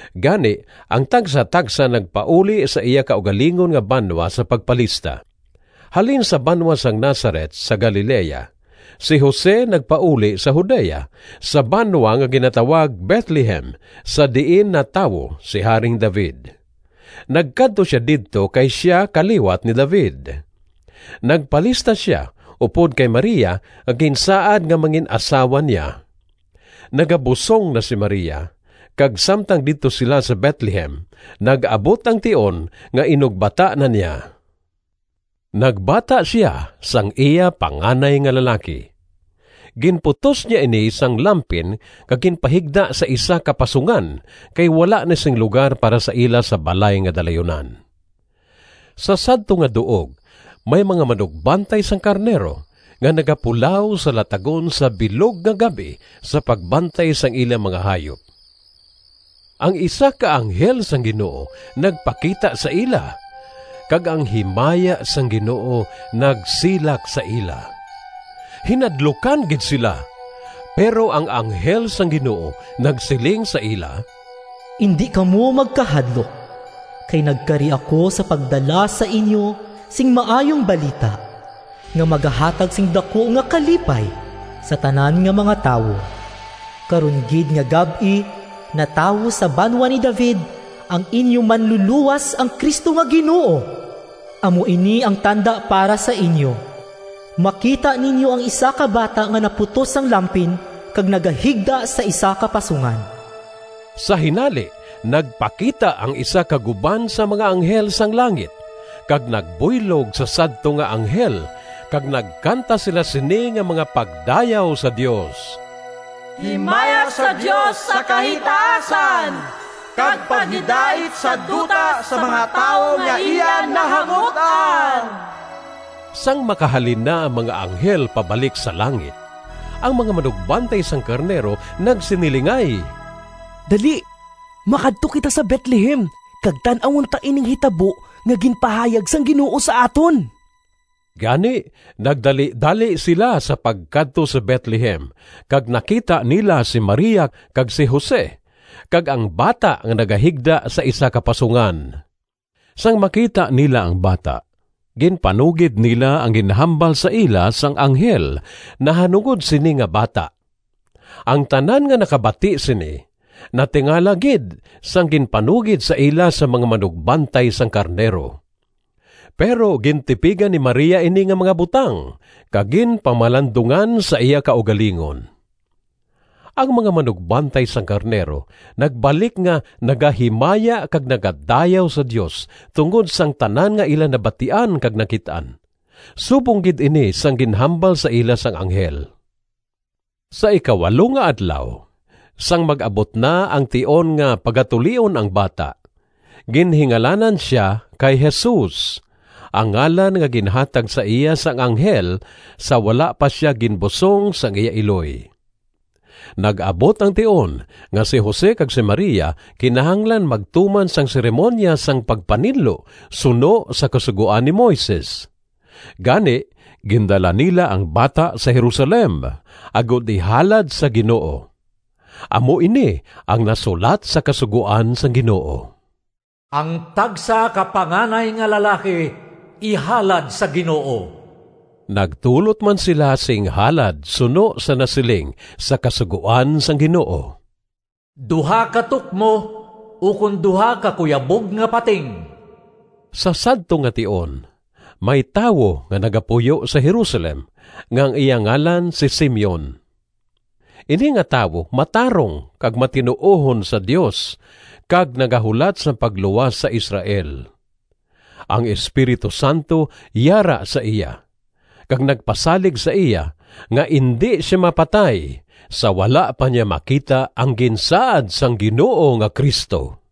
Gani ang tagsatagsa nagpauli sa iya kaugalingon nga banwa sa pagpalista. Halin sa banwa sang Nazaret sa Galilea, si Jose nagpauli sa Judea, sa banwa nga ginatawag Betlehem, sa diin natawo si Haring David. Nagkadto sia didto kay sia kaliwat ni David. Nagpalista sia upod kay Maria nga ginsaad nga mangin-asawa niya. Nagabusong na si Maria, kag samtang didto sila sa Betlehem nag-abot ang tion nga inugbata na niya. Nagbata sia sang iya panganay nga lalaki. Ginputos niya ini sang lampin kag ginpahigda sa isa ka pasungan kay wala na sing lugar para sa ila sa balay nga dalayunan. Sa sadto nga duog may mga manugbantay sang karnero nga nagapulaw sa latagon sa bilog nga gab-i sa pagbantay sang ila mga hayop. Ang isa ka anghel sang Ginoo nagpakita sa ila, kag ang himaya sang Ginoo nagsilak sa ila. Hinadlukan gid sila, pero ang anghel sang Ginoo nagsiling sa ila, “Indi kamo magkahadlok! kay nagkari ako sa pagdala sa inyo sing Maayong Balita nga magahatag sing daku nga kalipay sa tanan nga mga tawo. Karon gid nga gab-i natawo sa banwa ni David ang inyo Manlulowas, ang Cristo nga Ginoo! Amo ini ang tanda para sa inyo: makita ninyo ang isa ka bata nga naputos sang lampin kag nagahigda sa isa ka pasungan.” Sa hinali nagpakita ang isa ka guban sang mga anghel sang langit kag nagbuylog sa sadto nga anghel kag nagkanta sila sini nga mga pagdayaw sa Dios: “Himaya sa Dios sa kahitaasan! Kag paghidait sa duta Sa mga tawo nga iya nahamut-an!” Sang makahalin na ang mga anghel pabalik sa langit, ang mga manugbantay sang karnero nagsinilingay, “Dali makadto kita sa Betlehem kag tan-awon ta ining hitabo nga ginpahayag sang Ginoo sa aton.” Gani, nagdalidali sila sa pagkadto sa Betlehem kag nakita nila si Maria kag si Jose, kag ang bata nga nagahigda sa isa ka pasungan. Sang makita nila ang bata, ginpanugid nila ang ginhambal sa ila sang anghel nahanungod sini nga bata. Ang tanan nga nakabati sini natingala gid sang ginpanugid sa ila sang mga manugbantay sang karnero. Pero gintipigan ni Maria ini nga mga butang kag ginpamalandungan sa iya kaugalingon. Ang mga manugbantay sang karnero nagbalik nga nagahimaya kag nagadayaw sa Dios tungod sang tanan nga ila nabatian kag nakit-an; subong gid ini sang ginhambal sa ila sang anghel. Sa ikawalo nga adlaw, sang mag-abot na ang tion nga pagatulion ang bata, ginhingalanan sia kay Jesus, ang ngalan nga ginhatag sa iya sang anghel sa wala pa sia ginbusong sang iya iloy. Nag-abot ang tion nga si Jose kag si Maria kinahanglan magtuman sang seremoniya sang pagpaninlo suno sa Kasugoan ni Moises. Gani, gindala nila ang bata sa Jerusalem agod ihalad sa Ginoo. Amo ini ang nasulat sa kasugoan sang Ginoo, “Ang tagsa ka panganay nga lalaki ihalad sa Ginoo.” Nagdulot man sila sing halad suno sa nasiling sa kasugoan sang Ginoo, “Duha ka tukmo, ukon duha ka kuyabog nga pating.” Sa sadto nga tion may tawo nga nagapuyo sa Jerusalem nga ang iya ngalan si Simeon. Ini nga tawo matarong kag matinuohon sa Dios, kag nagahulat sang pagluwas sa Israel. Ang Espiritu Santo yara sa iya, kag nagpasalig sa iya nga indi sia mapatay sa wala pa niya makita ang ginsaad sang Ginoo nga Cristo.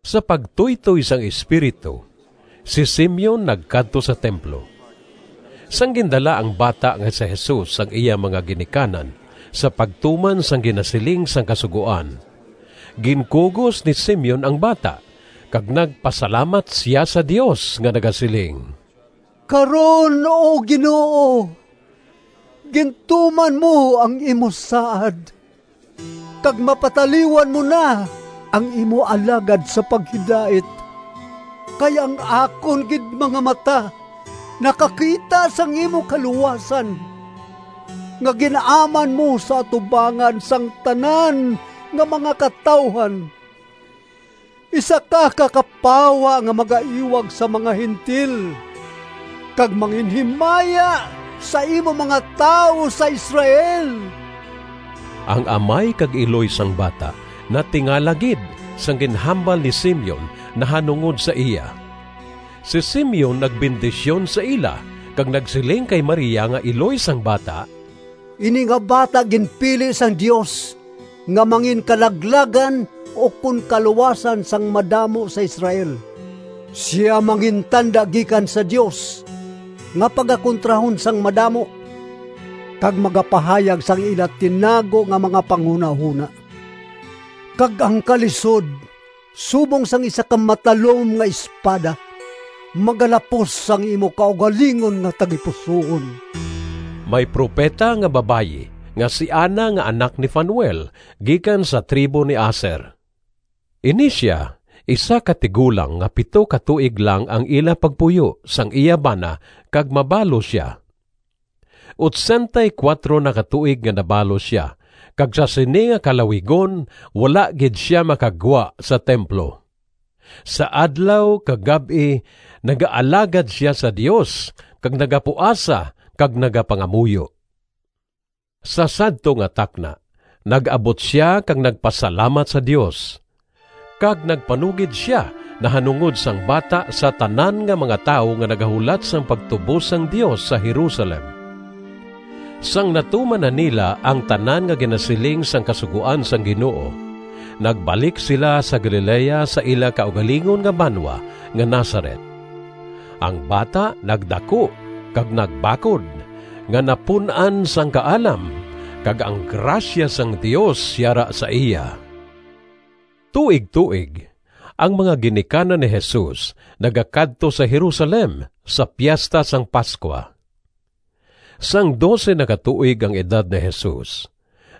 Sa pagtuytoy sang Espiritu, si Simeon nagkadto sa templo. Sang gindala ang bata nga si Jesus sang iya mga ginikanan sa pagtuman sang ginasiling sang Kasugoan, ginkugos ni Simeon ang bata kag nagpasalamat sia sa Dios nga nagasiling: “Karon, O Ginoo, Gintuman mo ang imo saad, Kag mapataliwan mo na Ang imo alagad sa paghidait. Kay ang akon gid mga mata Nakakita sang imo kaluwasan, Nga gin-aman mo sa atubangan Sang tanan nga mga katawuhan: Isa ka kapawa Nga magaiwag sa mga Gentil, Kag manginhimaya Sa imo mga tawo sa Israel.” Ang amay kag iloy sang bata natingala gid sang ginhambal ni Simeon nahanungod sa iya. Si Simeon nagbendisyon sa ila kag nagsiling kay Maria nga iloy sang bata, “Ini nga bata ginpili sang Dios nga manginkalaglagan ukon kaluwasan sang madamo sa Israel. Sia mangintanda gikan sa Dios nga pagakontrahon sang madamo, kag magapahayag sang ila tinago nga mga panghunahona. Kag ang kalisod, subong sang isa ka matalom nga espada, magalapos sang imo kaugalingon nga tagipusoon.” May propeta nga babayi nga si Ana nga anak ni Fanuel gikan sa tribo ni Aser. Ini sia isa ka tigulang nga pito ka tuig lang ang ila pagpuyo sang iya bana kag mabalo sia. Otsentay kuwatro na ka tuig nga nabalo sia kag sa sini nga kalawigon wala gid sia makagwa sa templo. Sa adlaw kag gab-i nagaalagad sia sa Dios kag nagapuasa kag nagapangamuyo. Sa sadto gid nga takna nag-abot sia kag nagpasalamat sa Dios, kag nagpanugid sia nahanungod sang bata sa tanan nga mga tawo nga nagahulat sang pagtubos sang Dios sa Jerusalem. Sang natuman na nila ang tanan nga ginasiling sang kasugoan sang Ginoo, nagbalik sila sa Galilea sa ila kaugalingon nga banwa nga Nazaret. Ang bata nagdaku kag nagbakod, nga napun-an sang kaalam, kag ang grasya sang Dios yara sa iya. Tuigtuig ang mga ginikanan ni Jesus nagakadto sa Jerusalem sa Piesta sang Pascua. Sang dose na ka tuig ang edad ni Jesus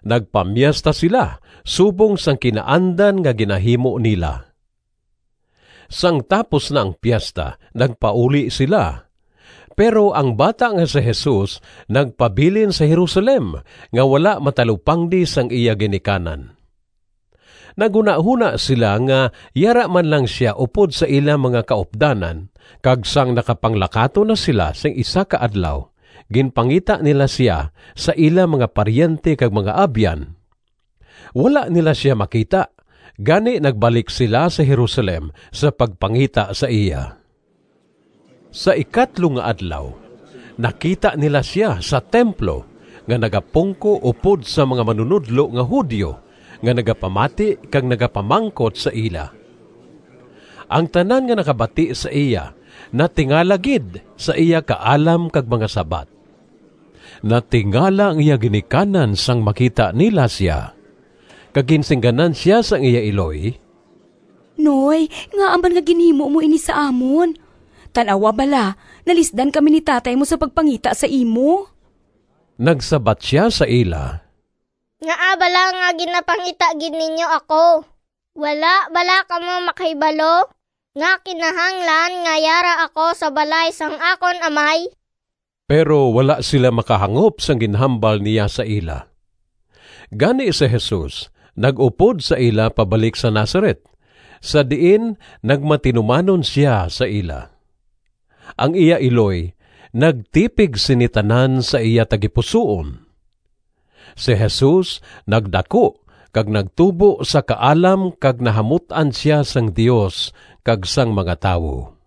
nagpamiesta sila subong sang kinaandan nga ginahimo nila. Sang tapos na ang piesta nagpauli sila, pero ang bata nga si Jesus nagpabilin sa Jerusalem nga wala matalupangdi sang iya ginikanan. Naghunahona sila nga yara man lang sia upod sa ila mga kaupdanan kag sang nakapanglakaton na sila sing isa ka adlaw ginpangita nila sia sa ila mga paryente kag mga abyan. Wala nila sia makita, gani nagbalik sila sa Jerusalem sa pagpangita sa iya. Sa ikatlo nga adlaw nakita nila sia sa templo nga nagapungko upod sa mga manunodlo nga Judio nga nagapamati kag nagapamangkot sa ila. Ang tanan nga nakabati sa iya natingala gid sa iya kaalam kag mga sabat. Natingala ang iya ginikanan sang makita nila sia, kag ginsingganan sia sang iya iloy, “Noy, ngaa man nga ginhimo mo ini sa amon? Tan-awa bala, nalisdan kami ni tatay mo sa pagpangita sa imo.” Nagsabat sia sa ila, “Ngaa bala nga ginapangita gid ninyo ako? Wala bala kamo makahibalo nga kinahanglan nga yara ako sa balay sang akon Amay?” Pero wala sila makahangop sang ginhambal niya sa ila. Gani si Jesus nag-upod sa ila pabalik sa Nazaret, sa diin nagmatinumanon sia sa ila. Ang iya iloy nagtipig sini tanan sa iya tagipusoon. Si Jesus nagdaku kag nagtubo sa kaalam kag nahamut-an sia sang Dios kag sang mga tawo.